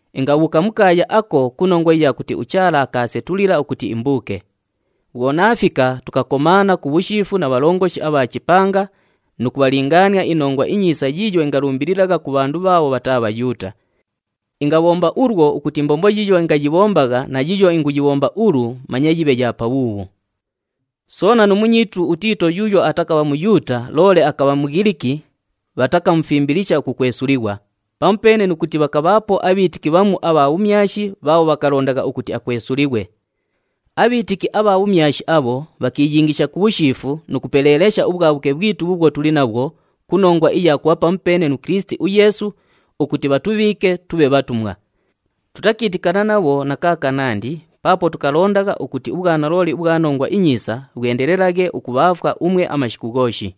Ingabhuuka mu kaaya ako ku nongwa iya kuti uChaala akaasetulila ukuti imbuuke. Bhwo naafika, tukakomaana ku bhushiifu na bhalongoshi abha chipanga nu kubhalingaania iNongwa iNyiisa yiiyo ingalumbililagha ku bhandu bhaabho bhataa Bhayuuta. Ingabhomba ulwo ukuti imbombo yiiyo ingayibhombagha na yiiyo inguyibhomba ulu manye yibhe ya pabhuubhu. Soona nu munyiitu uTiito yuuyo atakabha Muyuuta loole akabha Mughiliki, bhatakamufimbilisha ukukwesulighwa, pamupeene nu kuti bhakabhaapo abhiitiki bhamu abha bhumyashi bhaabho bhakalondagha ukuti akwesulighwe. Abhiitiki abha bhumyashi abho bhakiiyingisha ku bhushiifu nu kupeleelesha ubhwabhuke bhwitu bhuubhwo tuli nabhwo ku nongwa iya kubha pamupeene nu Kilisiti uYeesu ukuti bhatubhiike tubhe bhatumwa. Tutakiitikana nabho na kaakanandi paapo tukalondagha ukuti ubhwanalooli ubhwa Nongwa iNyiisa bhwendelelaghe ukubhaafwa umwe amashiku ghooshi.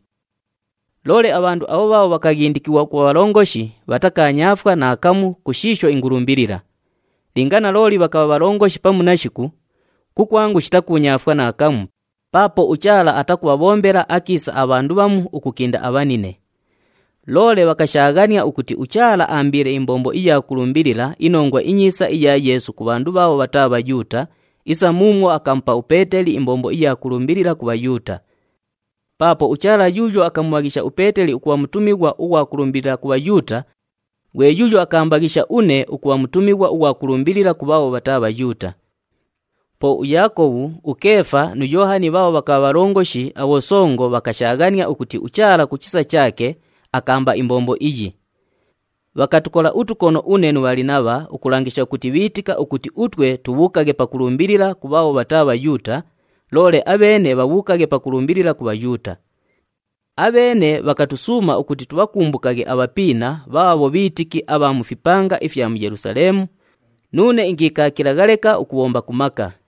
Loole abhandu abho bhaabho bhakaghindikighwa ukubha bhalongoshi bhatakaanyaafwa naakamu ku shiisho ingulumbilila. Linga nalooli bhakabha bhalongoshi pamu nashiku, kukwangu shitakuunyaafwa naakamu paapo uChaala atakubhabhombela akiisa abhandu bhamu ukukinda abhanine. Loole bhakashaaghania ukuti uChaala aambiile imbombo iya kulumbilila iNongwa iNyiisa iya Yeesu ku bhandu bhaabho bhataa Bhayuuta isa muumwo akamupa uPeeteli imbombo iya kulumbilila ku Bhayuuta. Paapo uChaala yuuyo akamubhaghisha uPeeteli ukubha mutumighwa ughwa kulumbilila ku Bhayuuta, ghwe yuuyo akaambaghisha une ukubha mutumighwa ughwa kulumbilila ku bhaabho bhataa Bhayuuta. Po uYaakobhu, uKeefa nu Yoohani bhaabho bhakabha bhalongoshi abhosongo bhakashaaghania ukuti uChaala ku chisa chaake akaamba imbombo iyi. Bhakatukola utukono une nu Bhalinabha ukulangisha ukuti bhiitika ukuti utwe tubhuukaghe pakulumbilila ku bhaabho bhataa Bhayuuta, loole abheene bhabhuukaghe pakulumbilila ku Bhayuuta. Abheene bhakatusuuma ukuti tubhakumbukaghe abhapiina bhaabho bhiitiki abha mu fipanga ifya mu Yelusaleemu, nuune ingiikaakilagha leka ukubhomba ku maka.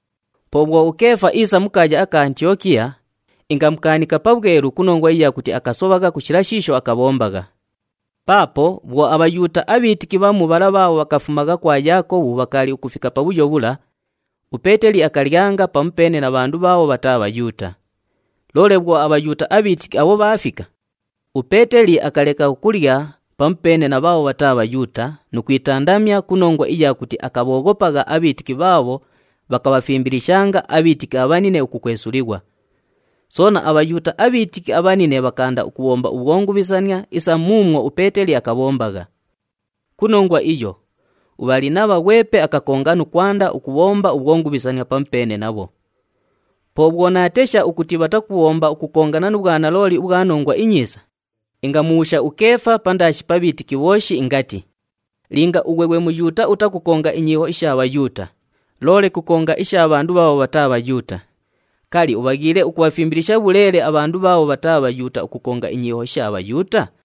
Po bhwo uKeefa iisa mu kaaya aka Antiyokiya, ingamukaanika pabhwelu ku nongwa iya kuti akasobhagha ku shila shiisho akabhombagha. Paapo bhwo aBhayuuta abhiitiki bhamu bhala bhaabho bhakafumagha kwa Yaakobhu bhakaali ukufika pabhuyo bhula, uPeeteli akalyanga pamupeene na bhandu bhaabho bhataa Bhayuuta. Loole bhwo aBhayuuta abhiitiki abho bhaafika, uPeeteli akaleka ukulya pamupeene na bhaabho bhataa Bhayuuta nu kwitandamya ku nongwa iya kuti akabhooghopagha abhiitiki bhaabho bhakabhafimbilishanga abhiitiki abhanine ukukwesulighwa. Soona, aBhayuuta abhiitiki abhanine bhakaanda ukubhomba ubhwongubhisania isa muumwo uPeeteli akabhombagha. Ku nongwa iyo, uBhalinabha ghwepe akakonga nu kwanda ukubhomba ubhwongubhisania pamupeene nabho. Po bhwo naatesha ukuti bhatakubhomba ukukongana nu bhwanalooli ubhwa Nongwa iNyiisa, ingamubhuusha uKeefa pandaashi pa bhiitiki bhooshi ingati, “Linga ughwe ghwe Muyuuta utakukonga inyiiho isha Bhayuuta, loole kukonga isha bhandu bhaabho bhataa Bhayuuta, kali, ubhaghiile ukubhafimbilisha bhuleele abhandu bhaabho bhataa Bhayuuta ukukonga inyiiho isha Bhayuuta?”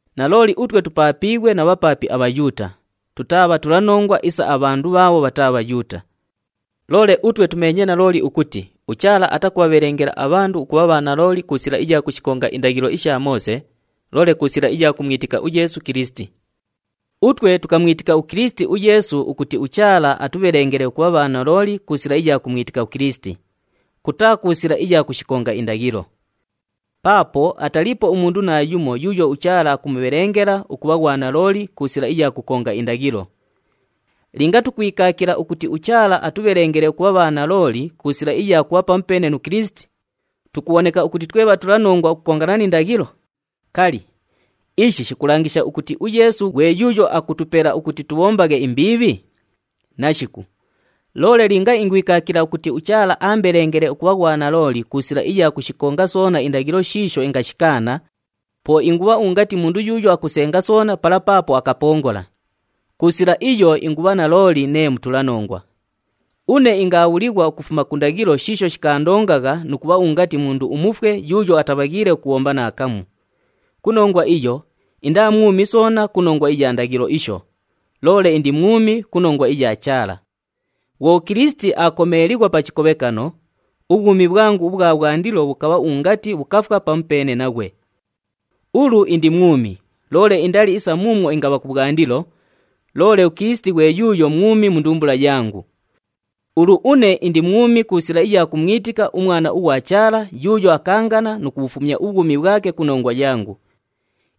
Nalooli utwe tupaapiighwe na bhapaapi aBhayuuta, tutaa bhatulanongwa isa abhandu bhaabho bhataa Bhayuuta. Loole utwe tumeenye nalooli ukuti uChaala atakubhabhelengela abhandu ukubha bhanalooli ku sila iya kushikonga indaghilo isha Moose, loole ku sila iya kumwitika uYeesu Kilisiti. Utwe tukamwitika uKilisiti uYeesu ukuti uChaala atubhelengele ukubha bhanalooli ku sila iya kumwitika uKilisiti, kutaa ku sila iya kushikonga indaghilo. Paapo ataliipo umundu naayumo yuuyo uChaala akumubhelengela ukubha ghwanalooli ku sila iya kukonga indaghilo. Linga tukwikaakila ukuti uChaala atubhelengele ukubha bhanalooli ku sila iya kubha pamupeene nu Kilisiti, tukubhoneka ukuti twe bhatulanongwa ukukongana ni ndaghilo, kali, ishi shikulangisha ukuti uYeesu ghwe yuuyo akutupela ukuti tubhombaghe imbiibhi? Nashiku! Loole linga ingwikaakila ukuti uChaala aambelengele ukubha ghwanalooli ku sila iya kushikonga soona indaghilo shiisho ingashikaana, po ingubha ungati mundu yuuyo akusenga soona pala paapo akapongola. Ku sila iyo ingubha nalooli nee mutulanongwa. Une ingaabhulighwa ukufuma ku ndaghilo shiisho shikaandongagha nu kubha ungati mundu umufwe yuuyo atabhaghiile ukubhomba naakamu. Ku nongwa iyo, indaa mwumi soona ku nongwa iya ndaghilo isho, loole indi mwumi ku nongwa iya Chaala. Bhwo uKilisiti aakomeelighwa pa chikobhekano, ubhwumi bhwangu ubhwa bhwandilo bhukabha ungati bhukafwa pamupeene naghwe. Ulu indi mwumi, loole indali isa muumwo ingabha kubhwandilo, loole uKilisiti ghwe yuuyo mwumi mu ndumbula yangu. Ulu une indi mwumi ku sila iya kumwitika uMwana ughwa Chaala yuuyo akaangana nu kubhufumya ubhwumi bhwake ku nongwa yangu.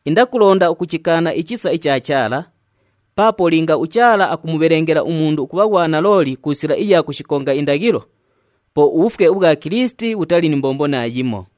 Indakulonda ukuchikaana ichisa icha Chaala, paapo linga uChaala akumubhelengela umundu ukubha ghwanalooli ku sila iya kushikonga indaghilo, po ubhufwe ubhwa Kilisiti bhutali ni mbombo naayimo.